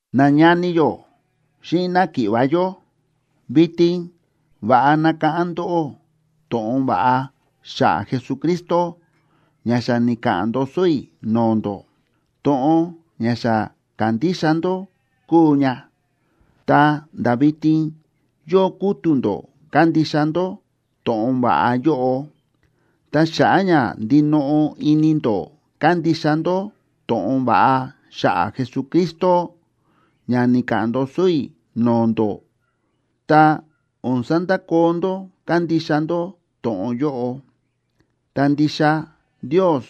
Nañani yó xíꞌin náki̱ꞌva̱ yó, vitin va̱ꞌa nakáꞌán ndóꞌó to̱ꞌon va̱ꞌa xa̱ꞌa̱ Jesucristo ña xa ni̱ka̱ꞌa̱n ndoso i̱ no̱o̱ ndó. To̱ꞌon ña xa ka̱ndixa ndó kúu ña, ta̱nda̱ vitin yóo kútu̱ ndó kándixa ndó to̱ꞌon va̱ꞌa yóꞌo. Ta xa̱ꞌa̱ ña ndinoꞌo ini ndó kándixa ndó to̱ꞌon va̱ꞌa xa̱ꞌa̱ Jesucristo ña ni̱ka̱ꞌa̱n ndoso i̱ no̱o̱ ndó, tá o̱n sandakoo ndó kándixa ndó to̱ꞌon yóꞌo, ta ndixa Ndios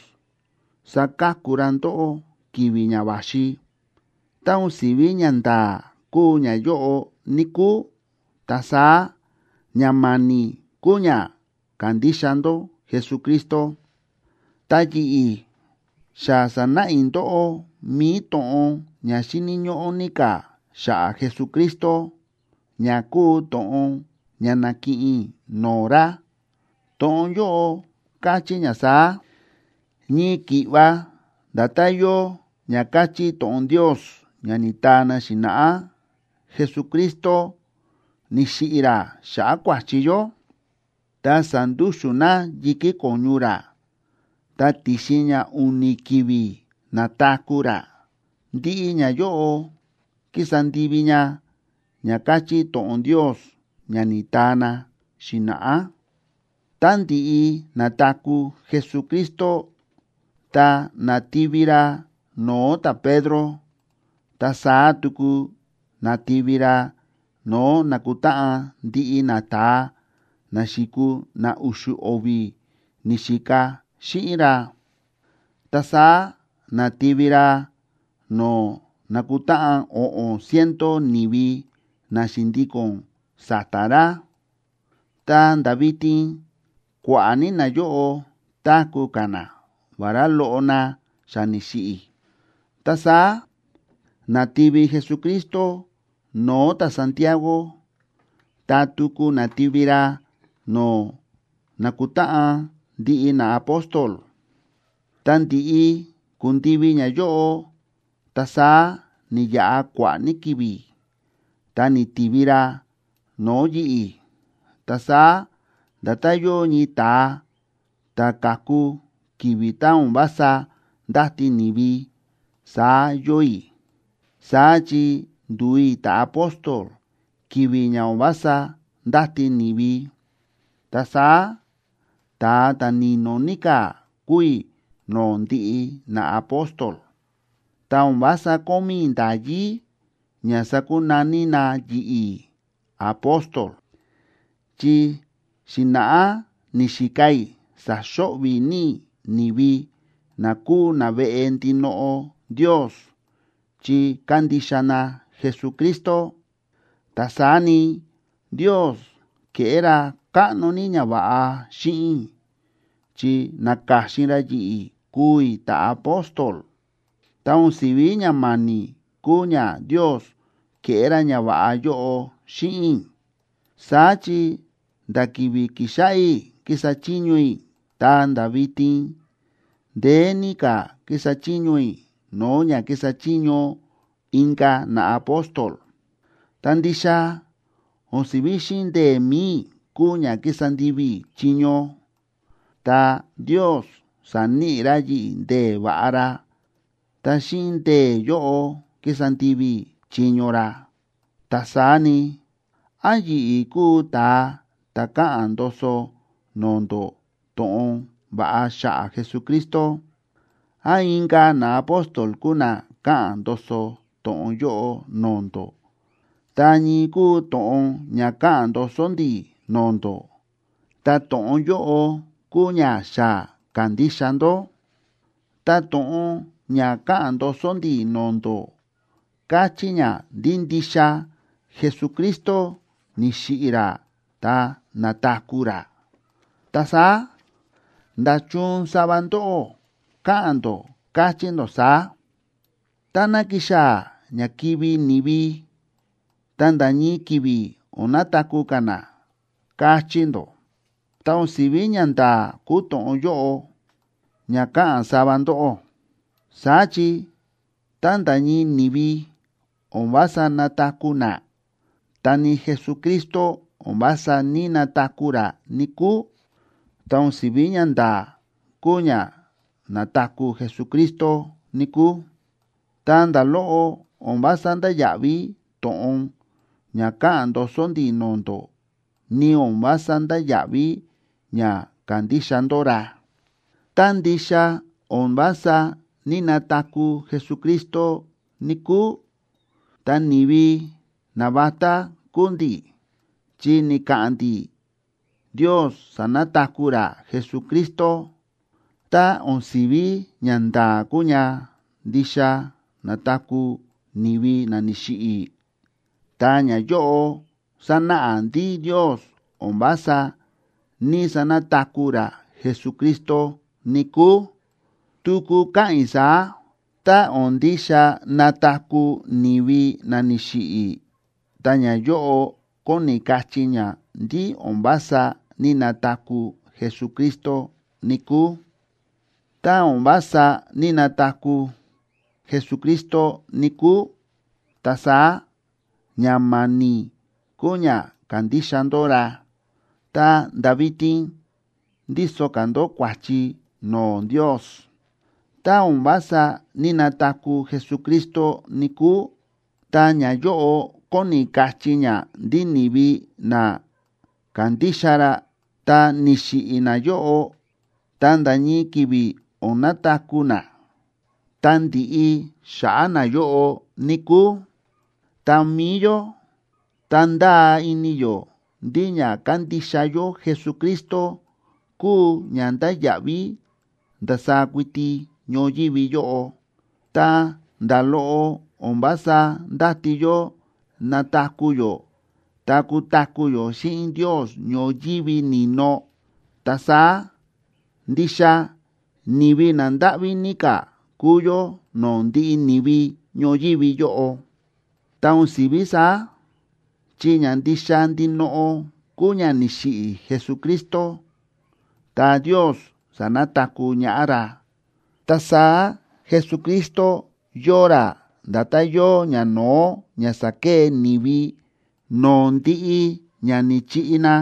saka̱ku ra ndóꞌó ki̱vi̱ ña va̱xi. Tá o̱n si̱ví ñanda̱a̱ kúu ñayóꞌo, níkúu, ta saá ña ma̱ni̱ kúu ña ka̱ndixa ndó Jesucristo. Ta yi̱ꞌi̱, xa sa̱náꞌa i̱ ndóꞌó mi̱i to̱ꞌon ña xíni̱ ñóꞌó ní ka̱ xa̱ꞌa̱ Jesucristo, ña kúu to̱ꞌon ña na̱kiꞌin i̱ no̱o̱ ra. To̱ꞌon yóꞌo káchí ña saá: Ñii ki̱ꞌva nda̱tán yóo ña káchí to̱ꞌon Ndios ña ni̱taa na xi̱na̱ꞌá, Jesucristo ni̱xiꞌi̱ ra xa̱ꞌa̱ kua̱chi yó, ta sa̱ndúxu̱n na yi̱kí ko̱ñu ra, ta ti̱xin ña u̱ni̱ ki̱vi̱, na̱taku̱ ra. Ndiꞌi ñayóꞌo ki̱sa ndivi ña ña káchí to̱ꞌon Ndios ña ni̱taa na xi̱na̱ꞌá. Tá ndi̱ꞌi na̱taku̱ Jesucristo, ta na̱tivi ra no̱o̱ ta̱Pedro, ta saá tuku na̱tivi ra no̱o̱ na̱kutáꞌan ndiꞌi nata̱a na xi̱kuu na u̱xu̱ o̱vi̱ ni̱xika xíꞌin ra. Ta saá na̱tivi ra no̱o̱ na̱kutáꞌan o̱ꞌo̱n ciento ni̱vi na xi̱ndíko̱n sa̱ta̱ ra. Ta nda̱ vitin kua̱ꞌa̱ ní nayóꞌo táku̱ ka̱ na, vará loꞌo na xa ni̱xiꞌi̱. Ta saá na̱tivi Jesucristo no̱o̱ ta̱Santiago,a ta tuku na̱tivi ra no̱o̱ na̱kutáꞌan ndiꞌi naapóstol. Ta ndi̱ꞌi ku̱ndivi ñayóꞌo, ta saá ni̱yaꞌa kua̱ꞌa̱ ní ki̱vi̱, ta ni̱tivi ra no̱o̱ yi̱ꞌi̱. Ta saá nda̱tán yóo ñii ta̱a ta̱ ka̱ku ki̱vi̱ tá o̱n vása ndáti ni̱vi, saá yóo i̱, saá chi ndu̱u i̱ ta̱apóstol ki̱vi̱ ña o̱n vása ndáti ni̱vi. Ta saá ta̱a ta̱ni̱no̱ ní ka̱ kúu i̱ no̱o̱ ndiꞌi naapóstol. Ta o̱n vása kómí i̱ nda̱yí ña sakunaní na yi̱ꞌi̱ “apóstol”, chi xi̱na̱ꞌá ni̱xika i̱ sa̱xo̱ꞌvi̱ ní i̱ ni̱vi na kúu naveꞌe ndinoꞌo Ndios chi kándixa na Jesucristo. Ta saá ni, Ndios ke̱ꞌé ra káꞌno ní ñava̱ꞌa xíꞌin i̱, chi na̱ka̱xin ra yi̱ꞌi̱ kuu i̱ ta̱apóstol. Ta o̱n si̱ví ña ma̱ni̱ kúu ña Ndios ke̱ꞌé ra ñava̱ꞌa yóꞌo xíꞌin i̱. Saá chi nda̱ ki̱vi̱ ki̱xáꞌá i̱ ki̱sa chiño i̱ ta̱nda̱ vitin, ndeé ní ka̱ kísa chiño i̱ no̱o̱ ña kísa chiño inka̱ naapóstol. Ta ndixa o̱n si̱ví xíꞌin ndee̱ mi̱i i̱ kúu ña kísa ndivi i̱ chiño, ta Ndios sa̱níꞌi ra yi̱ꞌi̱ ndee̱ va̱ꞌa ra, ta xíꞌin ndee̱ yóꞌo kísa ndivi i̱ chiño ra. Ta saá ni, án yi̱ꞌi̱ kúu ta̱a ta̱ káꞌa̱n ndoso no̱o̱ ndó to̱ꞌon va̱ꞌa xa̱ꞌa̱ Jesucristo, án inka̱ naapóstol kúu na káꞌa̱n ndoso to̱ꞌon yóꞌo no̱o̱ ndó, ta ñii kúu to̱ꞌon ña káꞌa̱n ndoso ndi̱ no̱o̱ ndó, ta to̱ꞌon yóꞌo kúu ña xa ka̱ndixa ndó. Ta to̱ꞌon ña káꞌa̱n ndoso ndi̱ no̱o̱ ndó káchí ña ndí ndixa Jesucristo ni̱xiꞌi̱ ra ta na̱taku̱ ra. Ta saá, ¿nda̱chun sava ndóꞌó káꞌa̱n ndó, káchí ndó saá: “Tá ná kixaa̱ ña kivi̱ ni̱vi, ta nda̱ ñii ki̱vi̱ o̱n nataku̱ ka̱ na”?, káchí ndó. Ta o̱n si̱ví ñanda̱a̱ kúu to̱ꞌon yóꞌo ña káꞌa̱n sava ndóꞌó. Saá chi tá nda̱ ñii ni̱vi o̱n vása nataku̱ na, ta ni Jesucristo o̱n vása ní‑nataku̱ ra, níkúu. Tá o̱n si̱ví ñanda̱a̱ kúu ña na̱taku̱ Jesucristo, níkúu, ta nda̱ loꞌo o̱n vása ndáya̱ꞌví to̱ꞌon ña káꞌa̱n ndoso ndi̱ no̱o̱ ndó, ni o̱n vása ndáya̱ꞌví ña ka̱ndixa ndó ra. Tá ndixa o̱n vása ní‑nataku̱ Jesucristo, níkúu, ta ni̱vi navatá kúu ndi̱, chi ni̱ka̱ꞌa̱n ndi̱ Ndios sa̱nataku̱ ra Jesucristo. Tá o̱n si̱ví ñanda̱a̱ kúu ña ndixa nataku̱ ni̱vi na ni̱xiꞌi̱, ta ñayóꞌo sánáꞌa ndí Ndios o̱n vása ní‑sanataku̱ ra Jesucristo, níkúu. Tuku káꞌa̱n i̱ saá: Tá o̱n ndixa nataku̱ ni̱vi na ni̱xiꞌi̱, ta ñayóꞌo kóni kachí ña ndí o̱n vása ní‑nataku̱ Jesucristo, níkúu. Tá o̱n vása ní‑nataku̱ Jesucristo, níkúu, ta saá ña ma̱ni̱ kúu ña ka̱ndixa ndó ra, ta̱nda̱ vitin ndíso ka̱ ndó kua̱chi no̱o̱ Ndios. Tá o̱n vása ní‑nataku̱ Jesucristo, níkúu, ta ñayóꞌo kóni kachí ña ndí ni̱vi na kándixa ra tá ni̱xiꞌi̱ nayóꞌo, ta nda̱ ñii ki̱vi̱ o̱n nataku̱ na, ta ndiꞌi xa̱ꞌa̱ nayóꞌo, níkúu. Ta mi̱i yó, tá ndáa ini yó ndí ña kándixa yó Jesucristo kúu ña ndáya̱ꞌví ndasaá kuiti ñoyívi yóꞌo, ta nda̱ loꞌo o̱n vása ndáti yó nataku̱ yó ta kutaku̱ yó xíꞌin Ndios ñoyívi ni̱no, ta saá ¡ndixa ni̱vi na ndáꞌví ní ka̱ kuu yó no̱o̱ ndiꞌi ni̱vi ñoyívi yóꞌo! Ta o̱n si̱ví saá, chi ña ndixa ndinoꞌo kúu ña ni̱xiꞌi̱ Jesucristo, ta Ndios sa̱nataku̱ ñaꞌá ra. Ta saá Jesucristo yóo ra nda̱tán yóo ñano̱ó ña sákee ni̱vi no̱o̱ ndiꞌi ña ni̱chiꞌi na,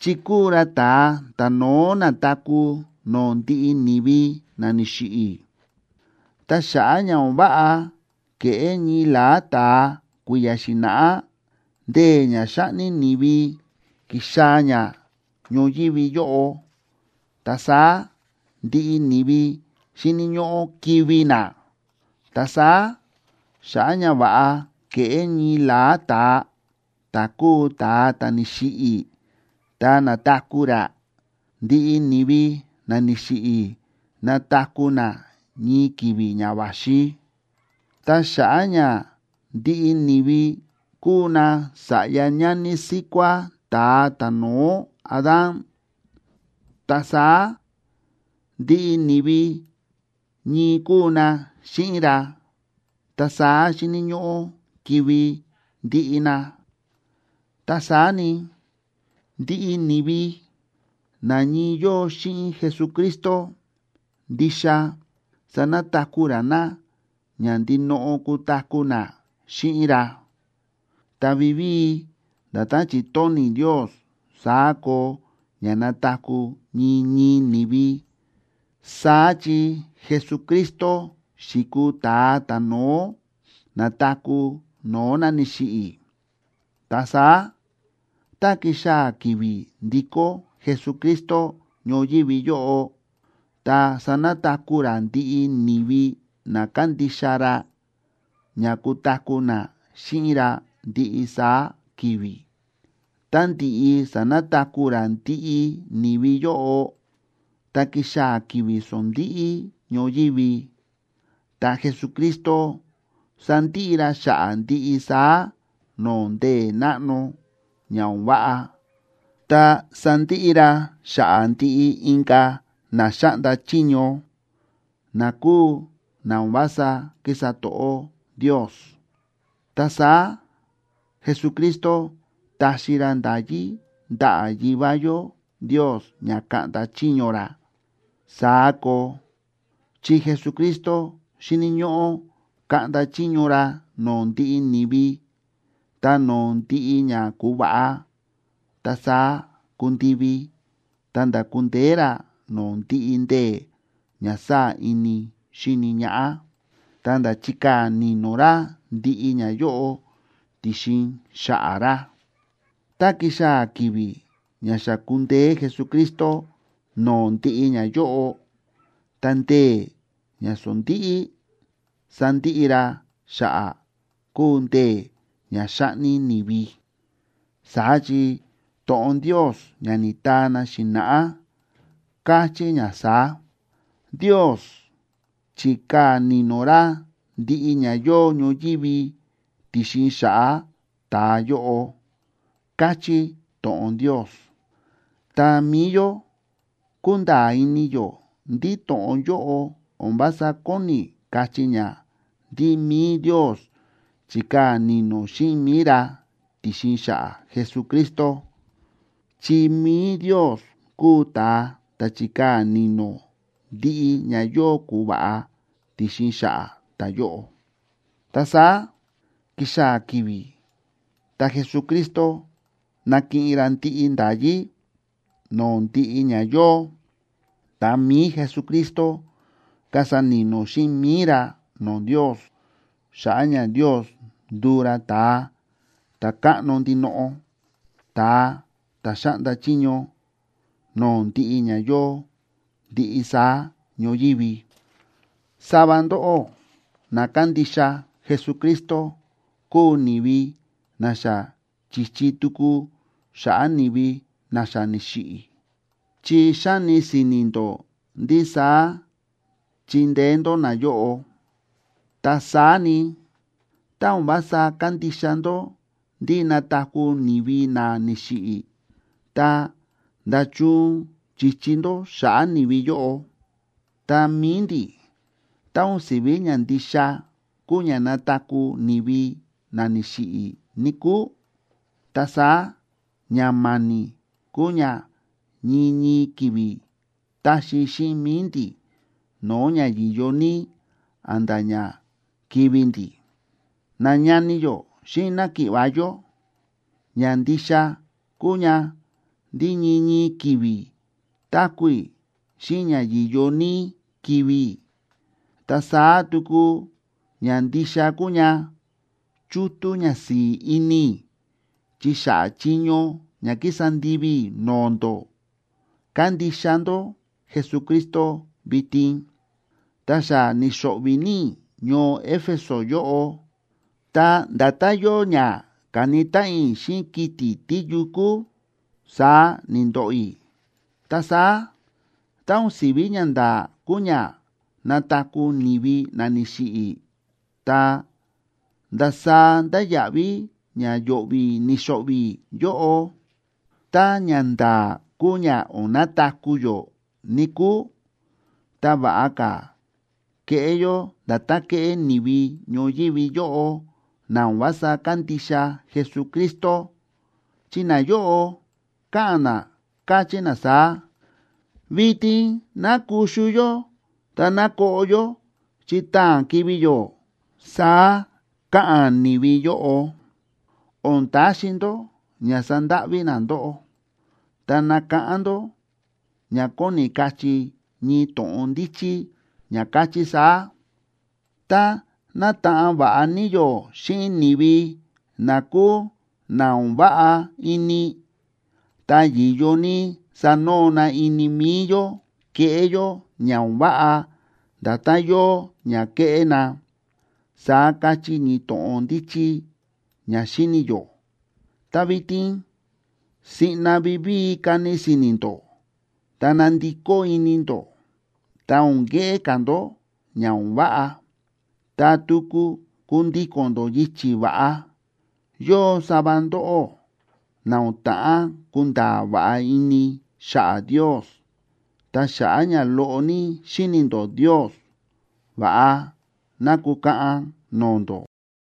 chi kúu ra ta̱a ta̱no̱ó na̱taku̱ no̱o̱ ndiꞌi ni̱vi na ni̱xiꞌi̱. Ta xa̱ꞌa̱ ña o̱n váꞌa ke̱ꞌé ñii la̱á ta̱a kui̱ya̱ xi̱na̱ꞌá, ndee̱ ña xáꞌni ni̱vi ki̱xaa̱ ña ñoyívi yóꞌo, ta saá ndiꞌi ni̱vi xíni̱ ñóꞌó kivi̱ na. Ta saá, xa̱ꞌa̱ ñava̱ꞌa ke̱ꞌé ñii la̱á ta̱a, ta̱ kúu ta̱a ta̱ ni̱xiꞌi̱ ta na̱taku̱ ra, ndiꞌi ni̱vi na ni̱xiꞌi̱ nataku̱ na ñii ki̱vi̱ ña va̱xi. Ta xa̱ꞌa̱ ña ndiꞌi ni̱vi kúu nasa̱ꞌya ñani síkuá ta̱a ta̱no̱ó Adán, ta saá ndiꞌi ni̱vi ñii kúu na xíꞌin ra, ta saá xíni̱ ñóꞌó kivi̱ ndiꞌi na. Ta saá ni, ndiꞌi ni̱vi na ñii yóo xíꞌin Jesucristo, ndixa sanataku̱ ra na ña ndinoꞌo kutaku̱ na xíꞌin ra. Ta vivíi, nda̱tán chi̱tóni̱ Ndios, saá koo ña nataku̱ ñii ñii ni̱vi. Saá chi Jesucristo xi̱kuu ta̱a ta̱no̱ó na̱taku̱ no̱o̱ na ni̱xiꞌi̱. Ta saá, tá kixaa̱ ki̱vi̱ ndikó Jesucristo ñoyívi yóꞌo, ta sanataku̱ ra ndiꞌi ni̱vi na kándixa ra ña kutaku̱ na xíꞌin ra ndiꞌi saá ki̱vi̱. Tá ndi̱ꞌi sa̱nataku̱ ra ndiꞌi ni̱vi yóꞌo, ta kixaa̱ ki̱vi̱ sondíꞌí ñoyívi, ta Jesucristo sandiꞌi ra xa̱ꞌa̱ ndiꞌi saá no̱o̱ ndee̱ náꞌno ña o̱n váꞌa, ta sandiꞌi ra xa̱ꞌa̱ ndiꞌi inka̱ na xáꞌnda chiño, na kúu na o̱n vása kísa to̱ꞌó Ndios. Ta saá Jesucristo taxi ra nda̱yí ndaꞌa̱ Yivá yó Ndios ña kaꞌnda chiño ra. Saá koo, chi Jesucristo xíni̱ ñóꞌó kaꞌnda chiño ra no̱o̱ ndiꞌi ni̱vi ta no̱o̱ ndiꞌi ña ku̱va̱ꞌa, ta saá kundivi ta̱nda̱ ku̱ndeé ra no̱o̱ ndiꞌi ndee̱ ña sáa̱ ini xíni ñaꞌá, ta̱nda̱ chi̱kaa̱ ni̱no̱ ra ndiꞌi ñayóꞌo ti̱xin xa̱ꞌa̱ ra. Tá kixaa̱ ki̱vi̱ ña xa kundeé Jesucristo no̱o̱ ndiꞌi ñayóꞌo, ta ndee̱ ña sondíꞌí sandiꞌi ra xa̱ꞌa̱ kúu ndee̱ ña xáꞌni ni̱vi. Saá chi to̱ꞌon Ndios ña ni̱taa na xi̱na̱ꞌá, káchí ña saá: “Ndios chi̱kaa̱ ni̱no̱ ra ndiꞌi ña yóo ñoyívi ti̱xin xa̱ꞌa̱ ta̱a yóꞌo”, káchí to̱ꞌon Ndios. Ta mi̱i yó kúnda̱a̱ ini yó ndí to̱ꞌon yóꞌo o̱n vása kóni kachí ña ndí mi̱i Ndios chikaa̱ ni̱no̱ xíꞌin mi̱i ra ti̱xin xa̱ꞌa̱ Jesucristo. Chi mi̱i Ndios kúu ta̱a ta̱ chikaa̱ ni̱no̱ ndiꞌi ña yóo ku̱va̱ꞌa ti̱xin xa̱ꞌa̱ ta̱yóꞌo. Ta saá kixaa̱ ki̱vi̱ tá Jesucristo nakiꞌin ra ndiꞌi nda̱yí no̱o̱ ndiꞌi ña yóo, ta mi̱i Jesucristo kasa ni̱no̱ xíꞌin mi̱i ra no̱o̱ Ndios, xa̱ꞌa̱ ña Ndios nduu ra ta̱a ta̱káꞌno ndinoꞌo, ta̱a ta̱ xáꞌnda chiño no̱o̱ ndiꞌi ña yóo ndiꞌi saá ñoyívi. Sava ndóꞌó na kándixa Jesucristo kúu ni̱vi na xa chi̱chi tuku xa̱ꞌa̱ ni̱vi na xa ni̱xiꞌi̱, chi xáni si̱ni̱ ndó ndí saá chindeé ndó nayóꞌo. Ta saá ni, tá o̱n vása kándixa ndó ndí nataku̱ ni̱vi na ni̱xiꞌi̱, ta, ¿nda̱chun chi̱chi ndó xa̱ꞌa̱ ni̱vi yóꞌo? Ta mi̱i ndi̱, tá o̱n si̱ví ña ndixa kúu ña nataku̱ ni̱vi na ni̱xiꞌi̱, níkúu, ta saá ña ma̱ni̱ kúu ña ñii ñii ki̱vi̱ táxi xíꞌin mi̱i ndi̱ no̱o̱ ña yi̱yo ní a̱nda̱ ña kivi̱ ndi̱. Nañani yó xíꞌin náki̱ꞌva̱ yó, ña ndixa kúu ña ndí ñii ñii ki̱vi̱ táku̱ i̱ xíꞌin ña yi̱yo ní kivi̱ i̱. Ta saá tuku ña ndixa kúu ña chútú ñasi̱i̱ ini i̱ chi xa̱ꞌa̱ chiño ña ki̱sa ndivi i̱ no̱o̱ ndó, kándixa ndó Jesucristo vitin. Ta xa ni̱xo̱ꞌvi̱ ní i̱ ñoo Éfeso yóꞌo, ta nda̱tán yóo ña ka̱ni táꞌan i̱ xíꞌin kiti̱ tíyukú, saá ni̱ndoꞌo i̱. Ta saá, tá o̱n si̱ví ñanda̱a̱ kúu ña nataku̱ ni̱vi na ni̱xiꞌi̱, ta, ¿ndasaá ndáya̱ꞌví ña yo̱ꞌvi̱ ni̱xo̱ꞌvi̱ i̱ yóꞌo? Tá ñanda̱a̱ kúu ña o̱n nataku̱ yó, níkúu, ta va̱ꞌa ka̱ keꞌé yó nda̱tán kéꞌé ni̱vi ñoyívi yóꞌo na o̱n vása kándixa Jesucristo, chi nayóꞌo káꞌa̱n na, káchí na saá: “Vitin ná kuxu yó ta ná koꞌo yó, chi taa̱n kivi̱ yó”, saá káꞌa̱n ni̱vi yóꞌo. O̱n taxi ndó ña sandáꞌví na ndóꞌó, ta nakáꞌán ndó ña kóni kachí ñii to̱ꞌon ndíchí ña káchí saá: “Tá nátaꞌan va̱ꞌa ní yó xíꞌin ni̱vi na kúu na o̱n váꞌa ini, ta yi̱yo ní sanoo na ini mi̱i yó keꞌé yó ña o̱n váꞌa nda̱tán yóo ña kéꞌé na”, saá káchí ñii to̱ꞌon ndíchí ña xíni̱ yó. Ta vitin siꞌna vivíi kani si̱ni̱ ndó, ta nandikó ini ndó, ta o̱n keꞌé ka̱ ndó ña o̱n váꞌa, ta tuku kundíko̱n ndó yichi̱ va̱ꞌa. Yóo sava ndóꞌó na o̱n ta̱ꞌán kunda̱a̱ va̱ꞌa ini xa̱ꞌa̱ Ndios, ta xa̱ꞌa̱ ña loꞌo ní xíni̱ ndó Ndios, va̱ꞌa ná kukaꞌan no̱o̱ ndó.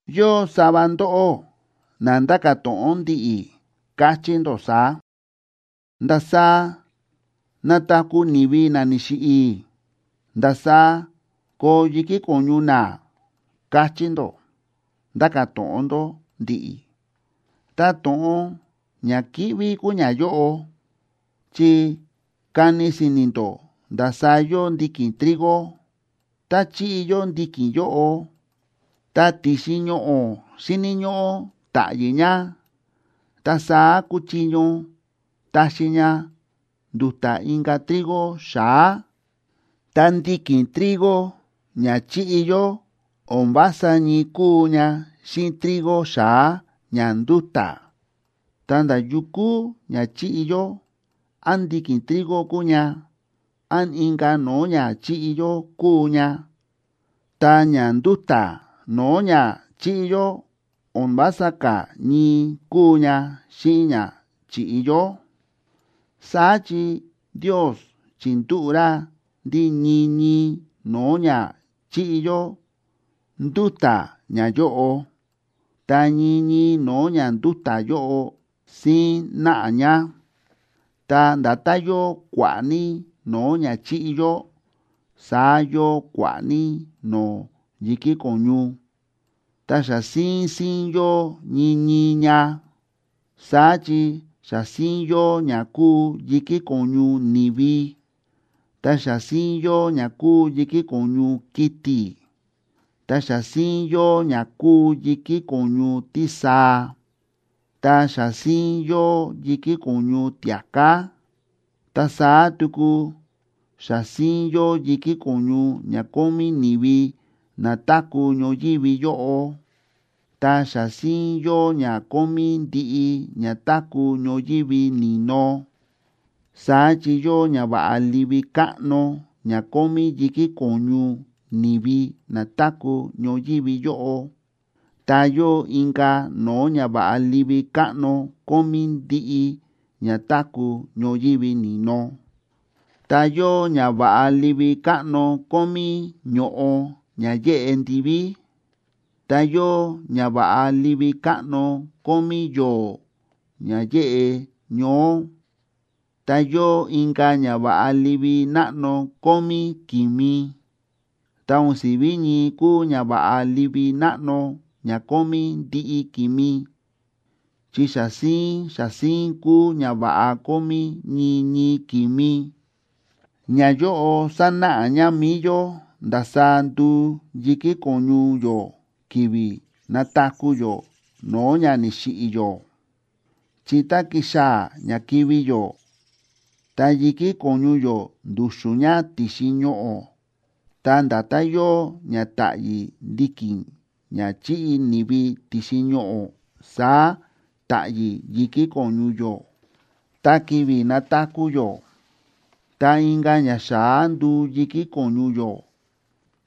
Yóo sava ndóꞌó na nda̱ka̱ to̱ꞌon ndi̱ꞌi̱, kachí ndó saá: “¿Ndasaá nataku̱ ni̱vi na ni̱xiꞌi̱? ¿Ndasaá koo yi̱kí ko̱ñu na?”, kachí ndó, nda̱ka̱ to̱ꞌon ndó ndi̱ꞌi̱. ¡Ta to̱ꞌon ña kíꞌví kúu ñayóꞌo! Chi kani si̱ni̱ ndó ndasaá yóo ndiki̱n trigo. Tá chíꞌi yó ndiki̱n yóꞌo, ta ti̱xin ñoꞌo̱ xíni̱ ñóꞌó ta̱ꞌyi̱ ña, ta saá kuchiño taxi ña ndu̱ta̱ inka̱ trigo xa̱á. Ta ndiki̱n trigo ña chíꞌi yó o̱n vása ñii kúu ña xíꞌin trigo xa̱á ña ndúta̱. Ta nda̱ yukú ña chíꞌi yó, án ndiki̱n trigo kúu ña, án inka̱ no̱o̱ ña chíꞌi yó kúu ña, ta ña ndúta̱ no̱o̱ ña chi̱ꞌi yó o̱n vása ka̱ ñii kúu ña xíꞌin ña chi̱ꞌi yó. Saá chi Ndios chi̱ndúꞌu̱ ra ndí ñii ñii no̱o̱ ña chíꞌi yó ndúta̱ ñayóꞌo, ta ñii ñii no̱o̱ ña ndúta̱ yóꞌo, síín náꞌa ña. Ta nda̱tán yóo kua̱ꞌa̱ ní no̱o̱ ña chíꞌi yó, saá yóo kua̱ꞌa̱ ní no̱o̱ yi̱kí ko̱ñu, ta xa síín síín yóo ñii ñii ña. Saá chi xa síín yóo ña kúu yi̱kí ko̱ñu ni̱vi, ta xa síín yóo ña kúu yi̱kí ko̱ñu kiti̱, ta xa síín yóo ña kúu yi̱kí ko̱ñu tísaa, ta xa síín yóo yi̱kí ko̱ñu tia̱ká. Ta saá tuku xa síín yóo yi̱kí ko̱ñu ña kómí ni̱vi na táku̱ ñoyívi yóꞌo, ta xa síín yóo ña kómí ndiꞌi ña táku̱ ñoyívi ni̱no. Saá chi yóo ñava̱ꞌa livi káꞌno ña kómí yi̱kí ko̱ñu ni̱vi na táku̱ ñoyívi yóꞌo, ta yóo inka̱ no̱o̱ ñava̱ꞌa livi káꞌno kómí ndiꞌi ña táku̱ ñoyívi ni̱no. Ta yóo ñava̱ꞌa livi káꞌno kómí ño̱ꞌo ña yéꞌe ndiví, ta yóo ñava̱ꞌa livi káꞌno kómí yo̱o̱ ña yéꞌe ñoó, ta yóo inka̱ ñava̱ꞌa livi náꞌno kómí ki̱mi. Ta o̱n si̱ví ñii kúu ñava̱ꞌa livi náꞌno ña kómí ndiꞌi ki̱mi, chi xa síín xa síín kúu ñava̱ꞌa kómí ñii ñii ki̱mi. Ñayóꞌo sánáꞌa ña mi̱i yó ndasaá nduu yi̱kí ko̱ñu yó ki̱vi̱ nataku̱ yó no̱o̱ ña ni̱xiꞌi̱ yó. Chi tá kixaa̱ ña kivi̱ yó, ta yi̱kí ko̱ñu yó ndu̱xu̱n ña ti̱xin ñoꞌo̱, ta nda̱tán yóo ña táꞌyi̱ ndiki̱n ña chi̱ꞌi ni̱vi ti̱xin ñoꞌo̱, saá ta̱ꞌyi̱ yi̱kí ko̱ñu yó. Ta ki̱vi̱ nataku̱ yó, ta inka̱ ñaxa̱á nduu yi̱kí ko̱ñu yó,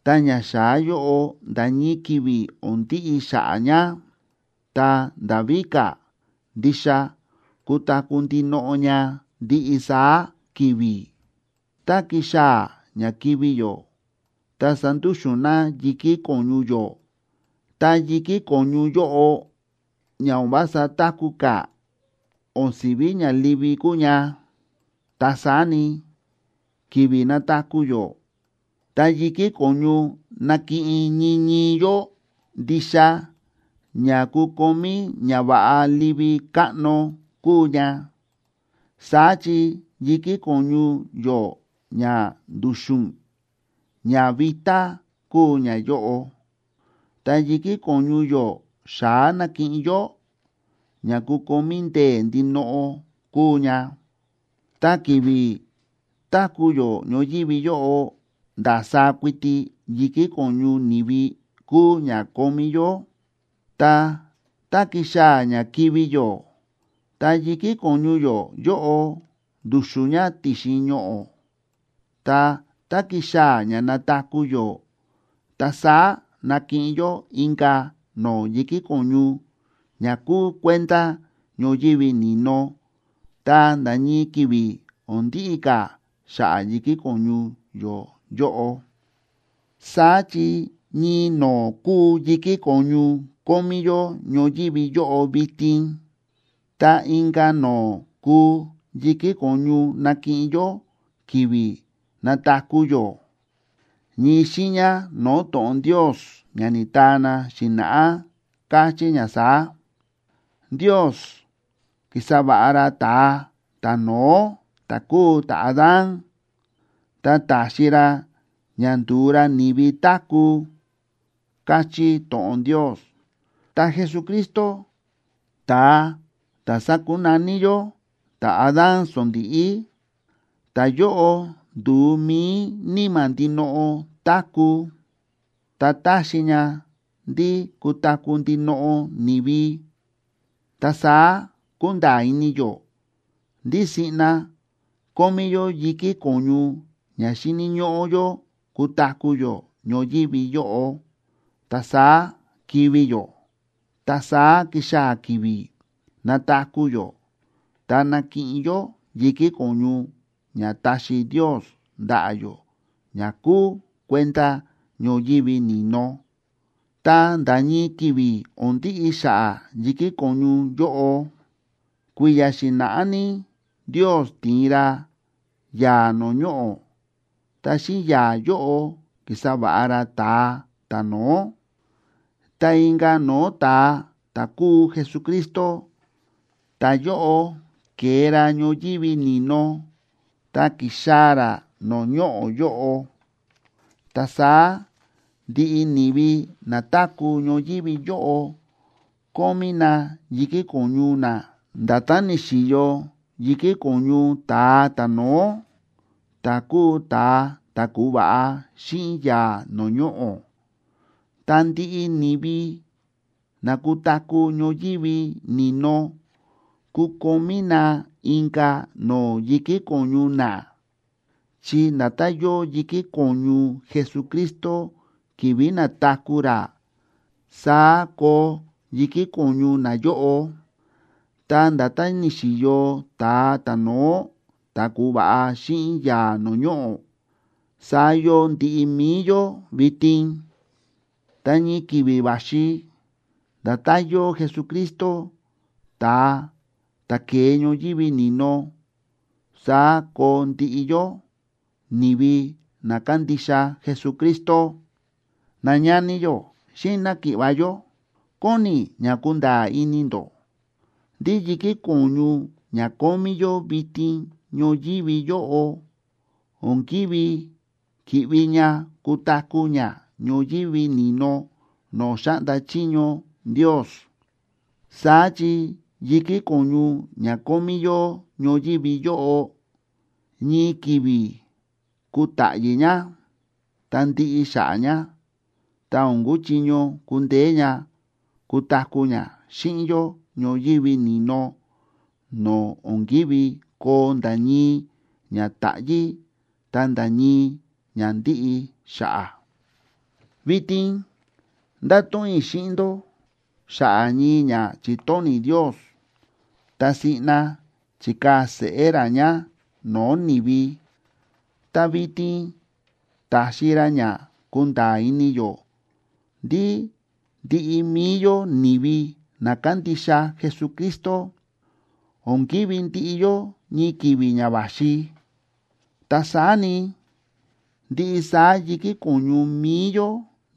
ta ñaxa̱á yóꞌo nda̱ ñii ki̱vi̱ o̱n ndiꞌi xa̱ꞌa̱ ña. Ta nda̱ víka̱, ndixa kutaku̱ ndinoꞌo ña ndiꞌi saá ki̱vi̱. Tá kixaa̱ ña kivi̱ yó ta sandúxu̱n na yi̱kí ko̱ñu yó, ta yi̱kí ko̱ñu yóꞌo ña o̱n vása táku̱ ka̱, o̱n si̱ví ña livi kuu ña. Ta saá ni, ki̱vi̱ nataku̱ yó, ta yi̱kí ko̱ñu nakiꞌin ñii ñii yó ndixa ña kukomí ñava̱ꞌa livi káꞌno kuu ña. Saá chi yi̱kí ko̱ñu yó ña ndu̱xu̱n, ña vitá kuu ñayóꞌo, ta yi̱kí ko̱ñu yó xa̱á nakiꞌin yó, ña kukomí ndee̱ ndinoꞌo kuu ña. Ta ki̱vi̱ táku̱ yó ñoyívi yóꞌo ndasaá kuiti yi̱kí ko̱ñu ni̱vi kúu ña kómí yó. Ta, tá kixaa̱ ña kivi̱ yó, ta yi̱kí ko̱ñu yó yóꞌo ndu̱xu̱n ña ti̱xin ñoꞌo̱. Ta tá kixaa̱ ña nataku̱ yó, ta saá nakiꞌin yó inka̱ no̱o̱ yi̱kí ko̱ñu ña kuu kuenda ñoyívi ni̱no, ta nda̱ ñii ki̱vi̱ o̱n ndiꞌi ka̱ xa̱ꞌa̱ yi̱kí ko̱ñu yó yóꞌo. Saá chi ñii no̱o̱ kúu yi̱kí ko̱ñu kómí yó ñoyívi yóꞌo vitin, ta inka̱ no̱o̱ kuu yi̱kí ko̱ñu nakiꞌin yó ki̱vi̱ nataku̱ yó. Ñii xiiña no̱o̱ to̱ꞌon Ndios ña ni̱taa na xi̱na̱ꞌá káchí ña saá: “Ndios ki̱sa va̱ꞌa ra ta̱a ta̱no̱ó ta̱ kúu ta̱Adán, ta ta̱xi ra ña ndu̱u ra ni̱vi táku̱”, káchí to̱ꞌon Ndios. Ta Jesucristo, ta̱a ta̱ sákunaní yó “ta̱Adán sondíꞌí”,b ta̱yóꞌo ndu̱u mi̱i níma̱ ndinoꞌo táku̱, ta táxi ña ndí kutaku̱ ndinoꞌo ni̱vi. Ta saá kúnda̱a̱ ini yó ndí siꞌna kómí yó yi̱kí ko̱ñu ña xíni̱ ñóꞌó yó kutaku̱ yó ñoyívi yóꞌo, ta saá kivi̱ yó. Ta saá kixaa̱ ki̱vi̱ nataku̱ yó ta nakiꞌin yó yi̱kí ko̱ñu ña taxi Ndios ndaꞌa̱ yó ña kúu kuenda ñoyívi ni̱no, ta nda̱ ñii ki̱vi̱ o̱n ndiꞌi xa̱ꞌa̱ yi̱kí ko̱ñu yóꞌo. Kui̱ya̱ xi̱na̱ꞌá ní Ndios ti̱in ra yaa̱ no̱o̱ ñoꞌo̱, ta xíꞌin yaa̱ yóꞌo ki̱sa va̱ꞌa ra ta̱a ta̱no̱ó. Ta inka̱ no̱o̱ ta̱a, ta̱ kúu Jesucristo, ta̱yóꞌo ke̱e ra ñoyívi ni̱no ta ki̱xaa̱ ra no̱o̱ ñoꞌo̱ yóꞌo. Ta saá ndiꞌi ni̱vi na táku̱ ñoyívi yóꞌo kómí na yi̱kí ko̱ñu na nda̱tán ni̱xi̱yo yi̱kí ko̱ñu ta̱a ta̱no̱ó, ta̱ kúu ta̱a ta̱ ku̱va̱ꞌa xíꞌin yaa̱ no̱o̱ ñoꞌo̱. Ta ndiꞌi ni̱vi na kutaku̱ ñoyívi ni̱no kukomí na inka̱ no̱o̱ yi̱kí ko̱ñu na, chi nda̱tán yóo yi̱kí ko̱ñu Jesucristo ki̱vi̱ na̱taku̱ ra, saá koo yi̱kí ko̱ñu nayóꞌo. Ta nda̱tán ni̱xi̱yo ta̱a ta̱no̱ó ta̱ ku̱va̱ꞌa xíꞌin yaa̱ no̱o̱ ñoꞌo̱, saá yóo ndiꞌi mi̱i yó vitin. Ta ñii ki̱vi̱ va̱xi nda̱tán yóo Jesucristo, ta̱a ta̱ ke̱e ñoyívi ni̱no, saá koo ndiꞌi yó, ni̱vi na kándixa Jesucristo. Nañani yó xíꞌin náki̱ꞌva̱ yó, kóni i̱ ña kunda̱a̱ ini ndó ndí yi̱kí ko̱ñu ña kómí yó vitin ñoyívi yóꞌo, o̱n kívi ki̱ꞌvi ña kutaku̱ ña ñoyívi ni̱no no̱o̱ xáꞌnda chiño Ndios. Saá chi yi̱kí ko̱ñu ña kómí yó ñoyívi yóꞌo, ñii ki̱vi̱ kutáꞌyí ña ta ndiꞌi xa̱ꞌa̱ ña, ta o̱n kuchiño kundeé ña kutaku̱ ña xíꞌin yó ñoyívi ni̱no no̱o̱ o̱n kívi koo nda̱ ñii ña táꞌyi̱ ta nda̱ ñii ña ndíꞌi xa̱ꞌa̱. Vitin ndáto̱ꞌon i̱ xíꞌin ndó xa̱ꞌa̱ ñii ña chi̱tóni̱ Ndios ta siꞌna chi̱kaa̱ seꞌé ra ña no̱o̱ ni̱vi, ta vitin ta̱xi ra ña kúnda̱a̱ ini yó ndí ndiꞌi mi̱i yó ni̱vi na kándixa Jesucristo o̱n kivi̱ ndiꞌi yó ñii ki̱vi̱ ña va̱xi. Ta saá ni, ndiꞌi saá yi̱kí ko̱ñu mi̱i yó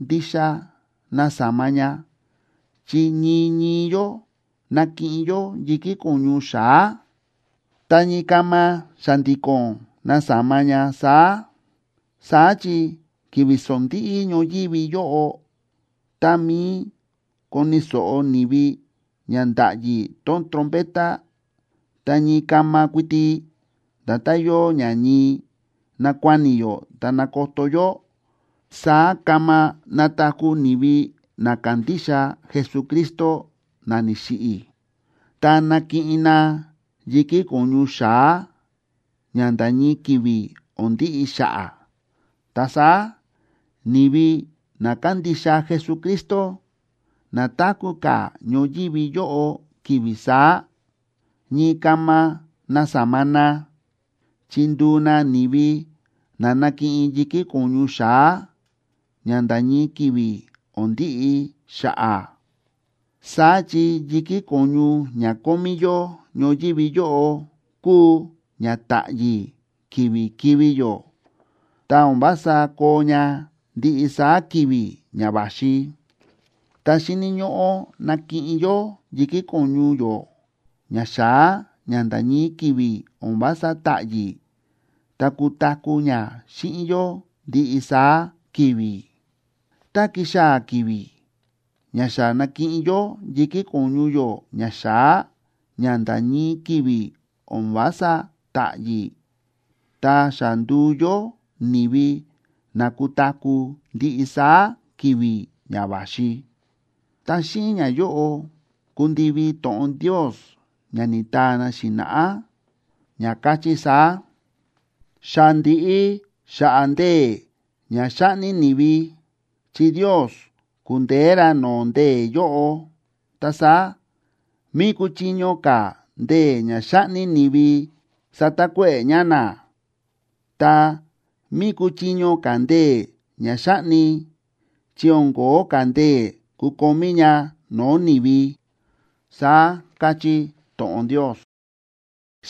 ndixa nasama ña, chi ñii ñii yó nakiꞌin yó yi̱kí ko̱ñu xa̱á. Ta ñii kama xa̱ndi̱ko̱n nasama ña saá. Saá chi ki̱vi̱ sondíꞌí ñoyívi yóꞌo tá mi̱i koni̱ so̱ꞌo ni̱vi ña ndáꞌyi tón trompeta, ta ñii kama kuiti, nda̱tán yóo ña ñii nákuáni yó ta nákoto yó, saá kama nataku̱ ni̱vi na ka̱ndixa Jesucristo na ni̱xiꞌi̱, ta nakiꞌin na yi̱kí ko̱ñu xa̱á, ña nda̱ ñii ki̱vi̱ o̱n ndiꞌi xa̱ꞌa̱. Ta saá ni̱vi na kándixa Jesucristo na táku̱ ka̱ ñoyívi yóꞌo ki̱vi̱ saá, ñii kama nasama na, chi nduu na ni̱vi na nakiꞌin yi̱kí ko̱ñu xa̱á ña nda̱ ñii ki̱vi̱ o̱n ndiꞌi xa̱ꞌa̱. Saá chi yi̱kí ko̱ñu ña kómí yó ñoyívi yóꞌo kúu ña ta̱ꞌyi̱ ki̱vi̱ kivi̱ yó, ta o̱n vása koo ña ndiꞌi saá ki̱vi̱ ña va̱xi. Ta xíni̱ ñóꞌó nakiꞌin yó yi̱kí ko̱ñu yó ña xa̱á ña nda̱ ñii ki̱vi̱ o̱n vása ta̱ꞌyi̱ ta kutaku̱ ña xíꞌin yó ndiꞌi saá ki̱vi̱. Tá kixaa̱ ki̱vi̱ ña xa na̱kiꞌin yó yi̱kí ko̱ñu yó ña xa̱á ña nda̱ ñii ki̱vi̱ o̱n vása ta̱ꞌyi̱, ta xa ndu̱u yó ni̱vi na kutaku̱ ndiꞌi saá ki̱vi̱ ña va̱xi, ta xíꞌin ñayóꞌo kundivi to̱ꞌon Ndios ña ni̱taa na xi̱na̱ꞌá, ña káchí saá: “Xa ndi̱ꞌi xa̱ꞌa̱ ndee̱ ña xáꞌni ni̱vi, chi Ndios ku̱ndeé ra no̱o̱ ndee̱ yóꞌo. Ta saá, ¿mí kúchiño ka̱ ndee̱ ña xáꞌni ni̱vi satakuéꞌe̱ ña na? Ta, ¿mí kúchiño ka̱ ndee̱ ña xáꞌni?, chi o̱n ko̱ó ka̱ ndee̱ kukomí ña no̱o̱ ni̱vi”, saá káchí to̱ꞌon Ndios.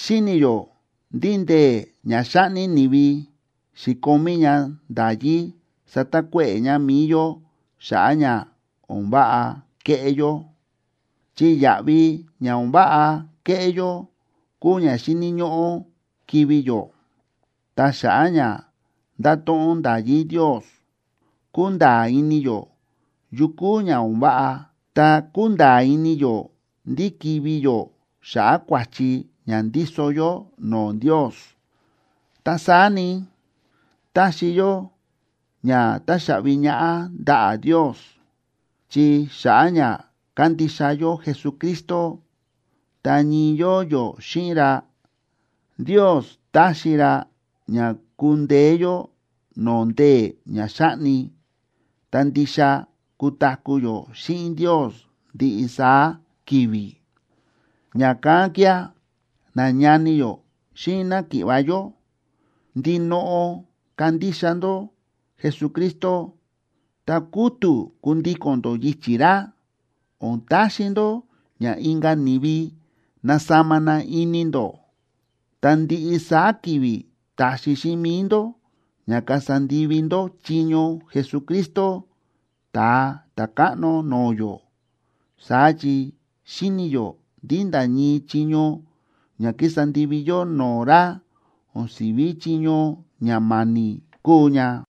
Xíni̱ yó ndí ndee̱ ña xáꞌni ni̱vi xi̱komí ña nda̱yí satakuéꞌe̱ ña mi̱i yó xa̱ꞌa̱ ña o̱n váꞌa kéꞌé yó, chi yaꞌvi ña o̱n váꞌa kéꞌé yó kúu ña xíni̱ ñóꞌó kivi̱ yó. Ta xa̱ꞌa̱ ña ndáto̱ꞌon nda̱yí Ndios, kúnda̱a̱ ini yó yu kúu ña o̱n váꞌa, ta kúnda̱a̱ ini yó ndí kivi̱ yó xa̱ꞌa̱ kua̱chi ña ndíso yó no̱o̱ Ndios. Ta saá ni, táxi yó ña táxaꞌvi ñaꞌá ndaꞌa̱ Ndios, chi xa̱ꞌa̱ ña kándixa yó Jesucristo, ta ñii yóo yó xíꞌin ra, Ndios táxi ra ña kundeé yó no̱o̱ ndee̱ ña xáꞌni, ta ndixa kutaku̱ yó xíꞌin Ndios ndiꞌi saá ki̱vi̱. Ña̱kán kía̱, nañani yó xíꞌin náki̱ꞌva̱ yó, ndinoꞌo kandixa ndó Jesucristo ta kútu̱ kundíko̱n ndó yichi̱ ra. O̱n taxi ndó ña inka̱ ni̱vi nasama na ini ndó, ta ndiꞌi saá ki̱vi̱ taxi xíꞌin mi̱i ndó ña kasa ndivi ndó chiño Jesucristo, Ta̱a Ta̱káꞌno no̱o̱ yó. Saá chi xíni̱ yó ndí nda̱ ñii chiño ña kísa ndivi yó no̱o̱ ra, o̱n si̱ví chiño ña ma̱ni̱ kúu ña.